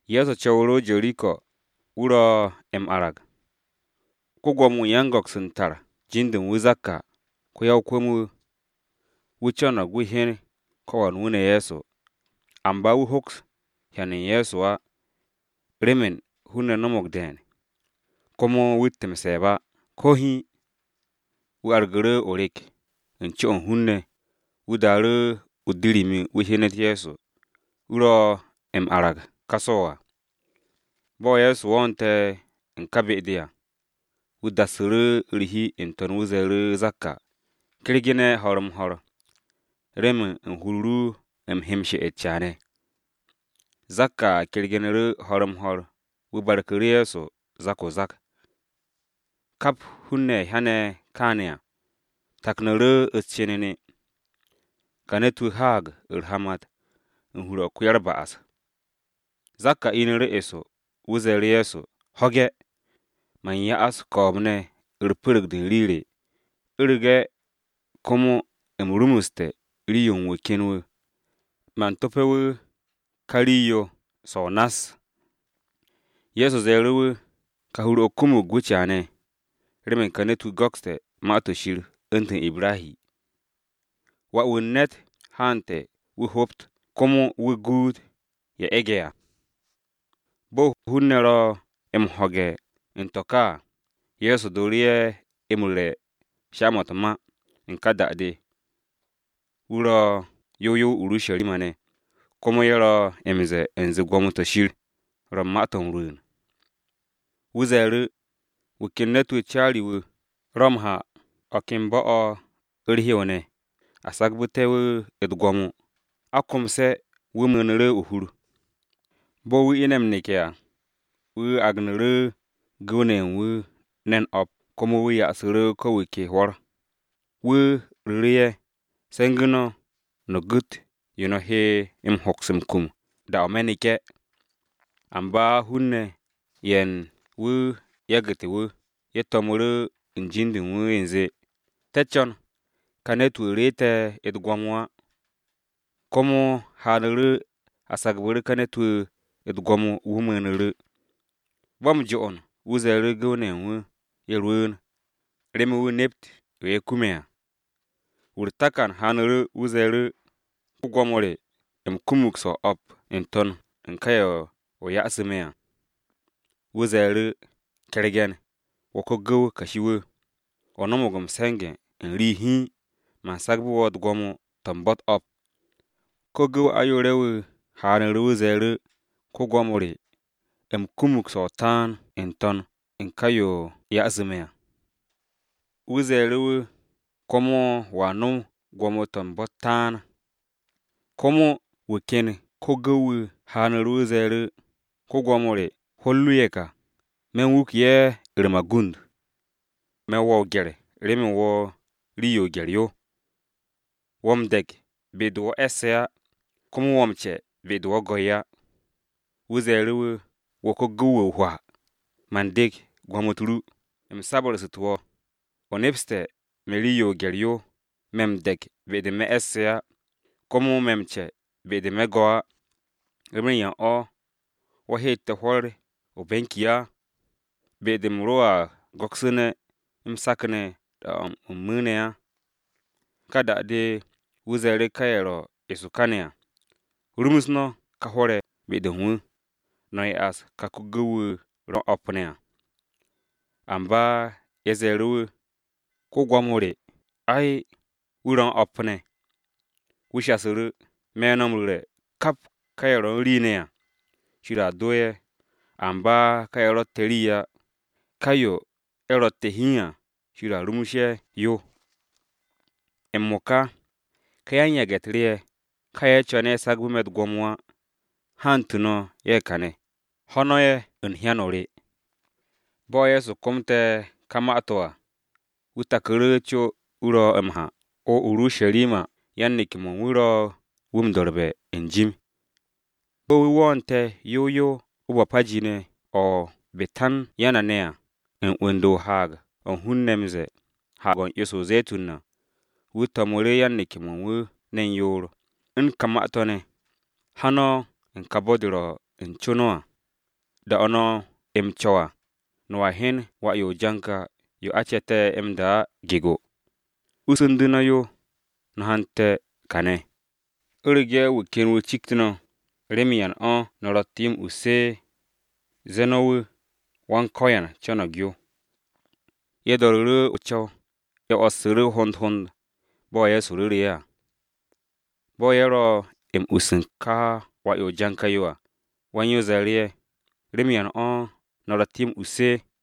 Ye̱so co̱wu̱ru̱ o-Jeriko wu̱ ro̱ m-arag. Ko-Gwo̱mo-wu̱ u̱n yan-go̱ks u̱n tar jin-de u̱n wu̱ Zakka, ko-ya-o-kwu̱m-wu̱. Wu̱ co̱no̱g wu̱ hyen ko̱ wan wu̱ ne̱ Ye̱so. Amba wu̱ hoks hyan u̱n Ye̱so á, remen hun-ne̱ no̱mo̱g de̱e̱n, komo wu̱tt m-se̱e̱b á ko̱ hiin. Wu̱ argu̱ru̱ o-rek u̱n co-o̱ u̱n hun-ne̱ wu̱ daaru̱ o-dirimi wu̱ hyenet Ye̱so, wu̱ ro̱ m-arag ka so̱ à. Bo̱ Ye̱so woote̱ u̱n ka be-de à, wu̱ dassu̱ru̱ u̱r-hi n-to̱n wu̱ ze̱e̱ru̱ Zakka, “Kergu̱ne̱ ho̱r-m-ho̱r, remen u̱n hur-o ru u̱m he m-she'et caane̱.” Zakka kergu̱nu̱ru̱ ho̱r-m-ho̱r wu̱ barku̱ru̱ Ye̱so zak-o-zak. Kap hun-ne̱ ye̱ hyane̱ kaane̱ à, taknu̱ru̱ u̱s-cenene, “Ka ne̱t-wu̱ haag u̱r-hamat u̱n hur-o̱ u̱n ko-ya-u̱r-ba'as!” Zakka inu̱ru̱ eso wu̱ ze̱e̱ru̱ Ye̱so, “Ho̱ge̱, man ya'as ko̱o̱b-ne̱ u̱r-pu̱ru̱g de u̱n rii re, u̱rege̱ komo u̱m rumuste̱ rii-yo u̱n wu̱ ken wu̱, man to̱pe̱ wu̱ ka rii-yo so̱ o-nass.” Ye̱so ze̱e̱ru̱ wu̱, “Ka hur-o̱ kumug gwu̱ caane̱, remen ka ne̱t-wu̱ go̱kste̱ Ma-to̱ Shir u̱ntu̱n Ibrahi. Wà-wu̱ u̱n ne̱t haante̱ wu̱ hobt, komo wu̱ guut ye̱ e̱ge̱ à.” Bo̱ hun-ne̱ ro̱ m-ho̱ge̱ u̱n to̱ ka à, Ye̱so dooru̱ ye̱ m-ru̱re̱ sha-mo̱ u̱t-ma. U̱n ka da-de, wu̱ ro yow yow o-Urusharima ne̱, komo ye̱ ro̱ m-ze̱e̱ u̱nze gwo̱mo-to̱ Shir ro̱ ma-to̱ m-rwu̱u̱n. Wu̱ ze̱e̱ru̱, “Wu̱ ken ne̱t caari-wu̱, ro̱ m-ha u̱n o̱ ken bo̱-o̱ u̱r-hew ne̱, a sagbu̱te̱ wu̱ u̱t-gwo̱mo, a komse̱ wu̱ mu̱u̱nu̱ru̱ o-hur. Bo̱ wu̱ ine̱ m-neke̱ à, wu̱ agnu̱ru̱ gu̱w-ne̱ ye̱ u̱n wu̱ ne̱n o̱p komo wu̱ yasu̱ru̱ ko̱ wu̱ ke hwo̱r. Wu̱ ru̱ru̱ ye̱, ‘Se̱ngu̱ no̱, no̱ gu̱t yo no̱ he m-hoks m-kum da-o̱ me̱ neke̱.’ Amba hun-ne̱ ye̱ u̱n wu̱ yagu̱te̱ wu̱, ye̱ to̱mu̱ru̱ n-jim de u̱n wu̱ u̱nze, ‘Te̱ co̱n ka ne̱t-wu̱ reete̱ u̱t-gwo̱mo á.’ “Komo haanu̱ru̱ a sagbu̱ru̱ ka ne̱t-wu̱ u̱t-gwo̱mo wu̱ mu̱u̱nu̱ru̱. Bo̱ m-jo'on, wu̱ ze̱e̱ru̱ gu̱w-ne̱ ye̱ u̱n wu̱ ye̱ rwu̱u̱n, remen wu̱ nept yo ye̱ kume̱ à. Wu̱ u̱r-takan haanu̱ru̱ wu̱ ze̱e̱ru̱, ‘Go̱s-wu̱, u̱m kumug so̱ o-o̱p n-to̱n u̱n ka ye̱ o yasu̱ me̱ à.’ Wu̱ ze̱e̱ru̱, ‘Ke̱rege̱n, wo̱ ko-gu̱w kashi-wu̱! O no̱mo̱g m-se̱nge̱ u̱n rii hiin, man sagbe̱ wo̱ u̱t-gwo̱mo to̱ u̱n bo̱-u̱t o̱p.’ Ko-gu̱w ayoore̱-wu̱, haanu̱ru̱ wu̱ ze̱e̱ru̱, ‘Go̱s-wu̱, u̱m kumug so̱ o-taan n-to̱n u̱n ka ye̱ o yasu̱ me̱ à.’ Wu̱ ze̱e̱ru̱ wu̱, ‘Komo wo̱a no̱m gwo̱mo-to̱ u̱n bo̱-u̱t taan.’ “Komo wu̱ ken ko-gu̱w-wu̱ haanu̱ru̱ wu̱ ze̱e̱ru̱, ‘Go̱s-wu̱, hwo̱r ru ye̱ ka, me̱ u̱n wuke̱ ye̱ u̱r-magund. Me̱ wo̱ o-gye̱r, remen wo̱ rii-yo o-gye̱r yo. Wo̱ m-de̱k be-de wo̱ e̱sse̱ á, komo wo̱ m-ce be-de wo̱ go̱ ye̱ á.’ Wu̱ ze̱e̱ru̱ wu̱, ‘Wo̱ ko-gu̱w-wu̱ o-hwaa! Man de̱k gom-u̱t ru, m-sabu̱rsu̱te̱ wo̱! O nepste̱ me̱ rii-yo o-gye̱r yo, me̱ m-de̱k be-de me̱ e̱sse̱ á, komo me̱ m-ce be-de me̱ go̱ á. ¿Remen yan o̱ wo̱ heete̱ hwo̱r re o-benki á, be-de u̱m ro̱a go̱ksu̱ne̱ m-sakne̱ da-o̱ u̱m mu̱u̱ne̱ á?’ “Ka da-de wu̱ ze̱e̱ru̱ ka ye̱ ro eso kane̱ à, ‘Rumus no̱ ka hwo̱r-ye̱ be-de u̱n wu̱, no̱ ya'as ka ko-gu̱w-wu̱ ro̱ u̱n o̱p ne̱ à.’ Amba ye̱ ze̱e̱ru̱ wu̱, ‘Go̱s-wu̱, ay, wu̱ ro̱ u̱n o̱p ne̱!’ Wu̱ shasu̱ru̱, ‘Me̱ no̱ m-ru̱re̱, kap ka ye̱ ro̱ u̱n rii ne̱ à, Shir a do ye̱, amba ka ye̱ rotte̱ rii á, ka yo ye̱ ro̱tte̱ hiin à, Shir a rumus ye̱ yo. M-mo̱ka, ka yan-yage̱-u̱t re ye̱, ka ye̱ co̱ne̱ a sagbe̱ me̱ u̱t-gwo̱mo á, hantu̱ no̱ ye̱ kane̱, ho̱ no̱ ye̱ u̱n hyan-o re!’” Bo̱ Ye̱so komte̱ ka ma-to̱ à, wu̱ taku̱ru̱ co wu̱ ro̱ m-ha o-Urusharima yan-neke̱-mo̱ u̱n wu̱ ro̱ wu̱ m-do̱rbe̱ n-jim. Bo̱ wu̱ wo̱o̱nte̱ yow yow o-Bapaji ne̱ o-Betanya ne̱ à, u̱n 'wu̱n-de o-haag o̱ hun-ne̱ m-ze̱e̱, Haag-o̱ u̱n 'yo-se o-Ze̱tun à, wu̱ to̱mu̱ru̱ yan-neke̱-mo̱ u̱n wu̱ ne̱n yoor u̱n kà ma-to̱ ne̱: “Ha no̱ u̱n ka bo̱-de ro̱ u̱n co no̱ à. Da-o̱ no̱ m-co̱w à, no̱a hyen wà-yo o-janka yo a ce̱te̱ m-da á gego. Ussu̱ndu̱ no̱ yo, no̱ hante̱ kane̱. U̱rege̱ wu̱ ken wu̱ cikt no̱, ‘¿Remen yan o̱ no̱ ro̱tte̱ yo m-us?’ Zee no̱ wu̱, ‘Go̱s-wu̱ co̱no̱g yo.’” Ye̱ do̱ru̱ru̱ o-co̱w, ye̱ 'wo̱ssu̱ru̱ hond hond, bo̱ Ye̱so ru̱ru̱ ye̱ à. Bo̱ ye̱ ro̱ m-us u̱n ka wà-yo o-janka yo à, wan-yo ze̱e̱ru̱ ye̱, “¿Remen yan o̱ no̱ ro̱tte̱ yo m-us?”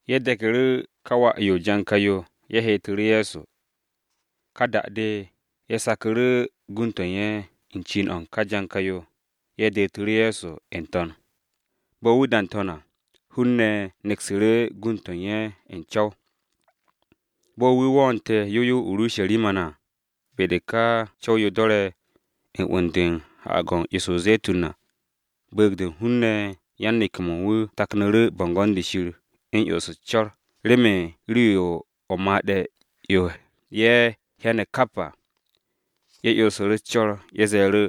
Ye̱ de̱ku̱ru̱ ka wà-yo o-janka yo ye̱ heetu̱ru̱ Ye̱so. Ka da-de, ye̱ saku̱ru̱ gund-to̱ u̱n ye̱ u̱n cin-o̱ u̱n ka janka-yo, ye̱ detu̱ru̱ Ye̱so n-to̱n. Bo̱ wu̱ da n-to̱n à, hun-ne̱ neksu̱ru̱ gund-to̱ u̱n ye̱ u̱n co̱w. Bo̱ wu̱ wo̱o̱nte̱ yow yow o-Urusharima ne̱ à, be-de ka co̱w-yo do̱re̱ u̱n 'wu̱n-de u̱n Haag-o̱ u̱n 'yo-se o-Ze̱tun à, bu̱u̱g-de u̱n hun-ne̱ yan-neke̱-mo̱ u̱n wu̱ taknu̱ru̱ bo̱ngo̱n-de Shir u̱n 'yons u̱s-co̱r remen rii-yo o-made̱ yo ye̱ hyane̱ kap à. Ye̱ 'yonsu̱ru̱ u̱s-co̱r, ye̱ ze̱e̱ru̱,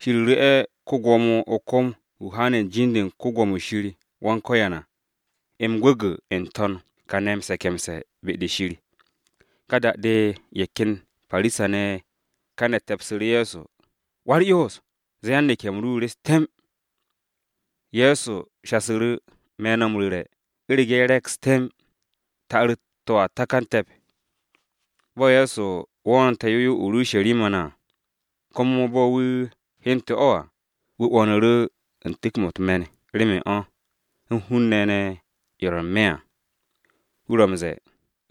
“Shir ru̱'e̱ ko-Gwo̱mo o-kom wu̱ haane̱ u̱n be̱e̱b-de u̱n Yawe à, m-gwu̱gwu̱ n-to̱n kane̱ m-se̱ke̱mse̱ be-de Shir!” Ka da-de ye̱ ken Parisa-ne̱ ye̱ kane̱ te̱psu̱ru̱ Ye̱so. “Wa-u̱r-Yoos, ze̱e̱ yan-neke̱-m ru ye̱ re̱s temb!” Ye̱so shasu̱ru̱, “Me̱ no̱ m-ru̱re̱, u̱rege̱ ye̱ reks temb, ta'ar-u̱t to̱a takan te̱p.” Bo̱ Ye̱so wo̱o̱nte̱ yow yow o-Urusharima ne̱ à, komo bo̱ wu̱ hyente̱ o̱ à, wu̱ 'wo̱nu̱ru̱ u̱n tu̱k-mo̱ u̱t-me̱n remen o̱, u̱n hun-ne̱ ne̱ ye̱ ro̱ n-me̱ à. Wu̱ ro̱ m-ze̱e̱,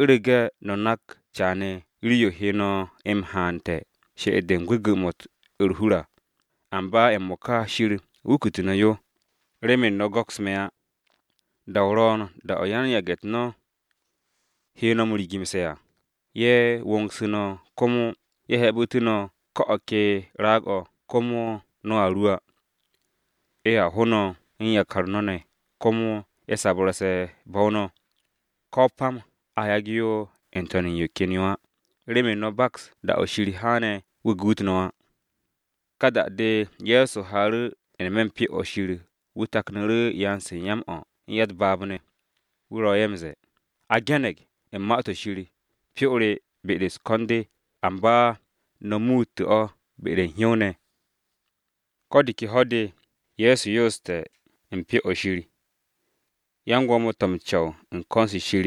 “U̱rege̱ no̱ nak caane̱ rii-yo he no̱ m-hante̱ she'et-de u̱n gwu̱gwu̱-mo̱ u̱r-hur à! Amba m-mo̱ka Shir wukute̱ no̱ yo, remen no̱ go̱ks me̱ á! Da-o̱ ro̱o̱n da-o̱ yan-yage̱-u̱t no̱ he no̱ m-rigu̱mse̱ à, ye̱ wo̱o̱ngsu̱ no̱ komo ye̱ hebu̱tu̱ no̱ ko̱ o̱ ke raag-o̱ komo no̱a ru á. Ye̱a ho no̱ u̱n yakar no̱ ne̱, komo ye̱ sabu̱rse̱ bo̱-o no̱, ko̱ o-pam a yage̱ yo n-to̱n u̱n yo ken yo á, remen no̱ baks da-o̱ Shir haane̱ wu̱ guut no̱ á!” Ka da-de Ye̱so haaru̱ n-me̱ u̱n Pyo-o̱ Shir. Wu̱ taknu̱ru̱ yan-se u̱n ya-m-o̱ u̱n ya-u̱t-baab ne̱. Wu̱ ro̱ ye̱ m-ze̱e̱, “A ge̱ne̱g u̱n Ma-to̱ Shir, ‘Hur-o re be-de u̱s-ko̱n de’ amba no̱ muute̱ o̱ be-de u̱n hyow-ne̱!” Ko̱ de ke ho̱-de Ye̱so yooste̱ u̱n Pyo-o̱ Shir. Gwo̱mo-ne̱ ye̱ u̱n ko̱n-se Shir,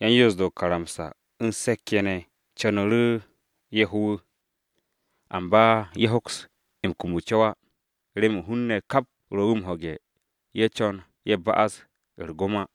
yan-Yoos-de o-karamsa, u̱n se̱k-ye̱ ne̱ co̱nu̱ru̱ ye̱ ho wu̱. Amba ye̱ hoks m-kum o-co̱w á, remen hun-ne̱ kap ro̱ wu̱ m-ho̱ge̱, ye̱ co̱n ye̱ ba'as u̱r-gom á.